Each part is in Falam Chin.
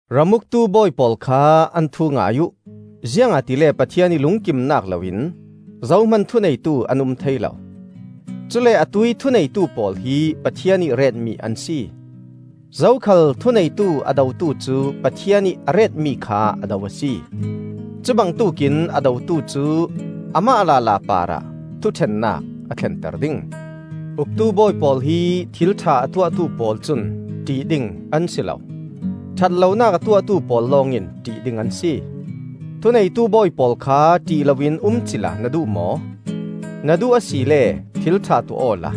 Ram uktu bawi pawl kha an thu ngai uh; ziangahtile Pathian ih lungkimnak loin zohman thuneitu an um thei lo; cule atuih thuneitu pawl hi Pathian ih retmi an si. Zokhal thuneitu a dotu cu Pathian ih a retmi kha a do a si. Cu bangtuk in a dotu cu amah lala parah thuṭhennak a thlenter ding. Uktu bawi pawl hi thil ṭha a tuahtu pawl cun ṭih ding an si lo; ṭhat lonak a tuahtu pawl lawngin ṭih ding an si. Thuneitu bawi pawl kha ṭih loin um cila na duh maw? Na duh asile thil ṭha tuah awla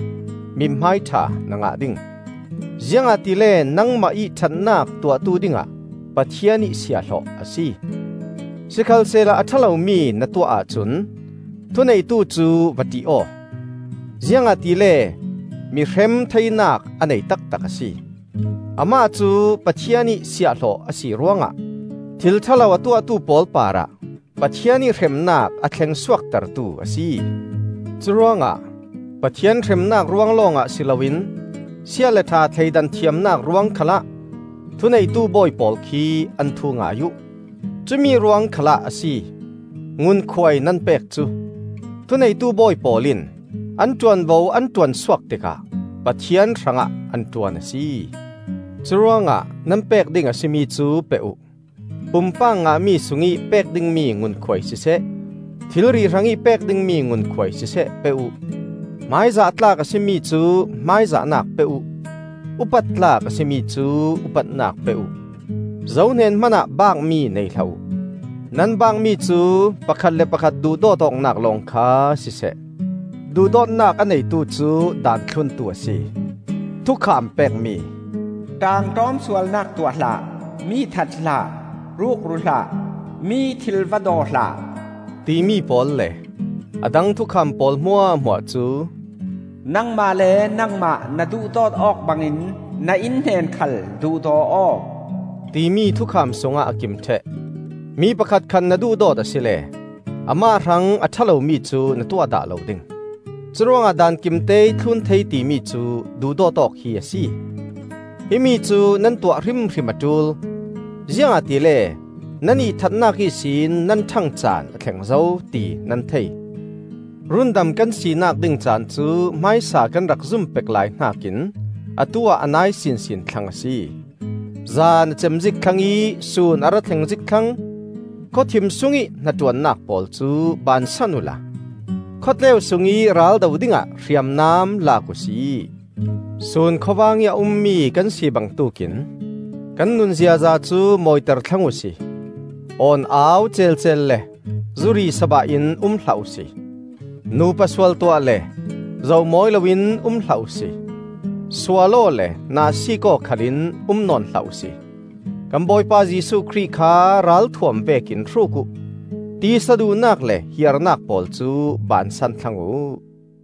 mithmai ṭha na ngah ding; ziangahtile nangmah ih ṭhatnak tuahtu dingah Pathian ih siahhlawh a si. Sikhalsehla a ṭha lomi na tuah ahcun thuneitu cu va ṭih aw; ziangahtile mi hrem theinak a nei taktak a si. Amah cu Pathian ih siahhlawh a si ruangah thil ṭha lo a tuahtu pawl parah Pathian ih hremnak a thleng suaktertu a si. Curuangah Pathian hremnak ruang lawngah si loin sia le ṭha thleidan thiamnak ruang khal ah thuneitu bawi pawl khi an thu ngai uh. Cumi ruang khalah a si ngunkhuai nan pek cu; thuneitu bawi pawl in an ṭuanvo an ṭuansuak tikah Pathian hrangah an ṭuan a si. Curuangah nan pek ding a si mi cu pe uh; pumpak ngahmi sungih pek dingmi ngunkhuai siseh, thilri hrangih pek dingmi ngunkhuai siseh pe uh. Hmaizah tlak a si mi cu hmaizahnak pe uh; upat tlak a si mi cu upatnak pe uh. Zohnen hmanah baakmi nei hlah uh. Nan baakmi cu pakhat le pakhat duhdawt awknak lawng kha siseh. Duhdawtnak a neitu cu Daan thluntu a si. Thukham pekmi, “ṭaangṭawm sualnak tuah hlah; mi that hlah; rukru hlah; mi ih thil va daw hlah,” timi pawl le a dang thukham pawl hmuahhmuah cu, “Nangmah le nangmah na duhdawt awk bangin na innhnen khal duhdaw aw,” timi thukham sungah a kim ṭheh. Mi pakhatkhat na duhdawt asile amah hrang a ṭha lomi cu na tuah dah lo ding. Curuangah Daan kimteih thlun thei timi cu duhdawt awk hi a si. Himi cu nan tuah hrimhrim a ṭul, ziangahtile nan ihthatnak ihsin nan ṭhang caan a thleng zo, ti nan thei. Rundam kan sinak ding caan cu hmaisa kan rak zum pek lai hnakin atu-ah a nai sinsin thlang a si. Zan a cem zik thlang ih sun a ra thleng zik thlang. Khawthim sungih hnaṭuannak pawl cu bansan uhla khawtleu sungih raldo dingah hriamnam lak uhsi. Sun khawvang ih a ummi kan si bangtuk in kan nun ziaza cu mawiter thlang uhsi: awn-au celcel le zuri sabah in um hlah uhsi; nupa sual tuah le zoh mawi loin um hlah uhsi; sual aw le nahsik aw khalin um nawn hlah uhsi. Kan Bawipa Jesuh Khrih kha ralthuam vekin hruk uh; tisa duhnak le hiarnak pawl cu bansan thlang uh.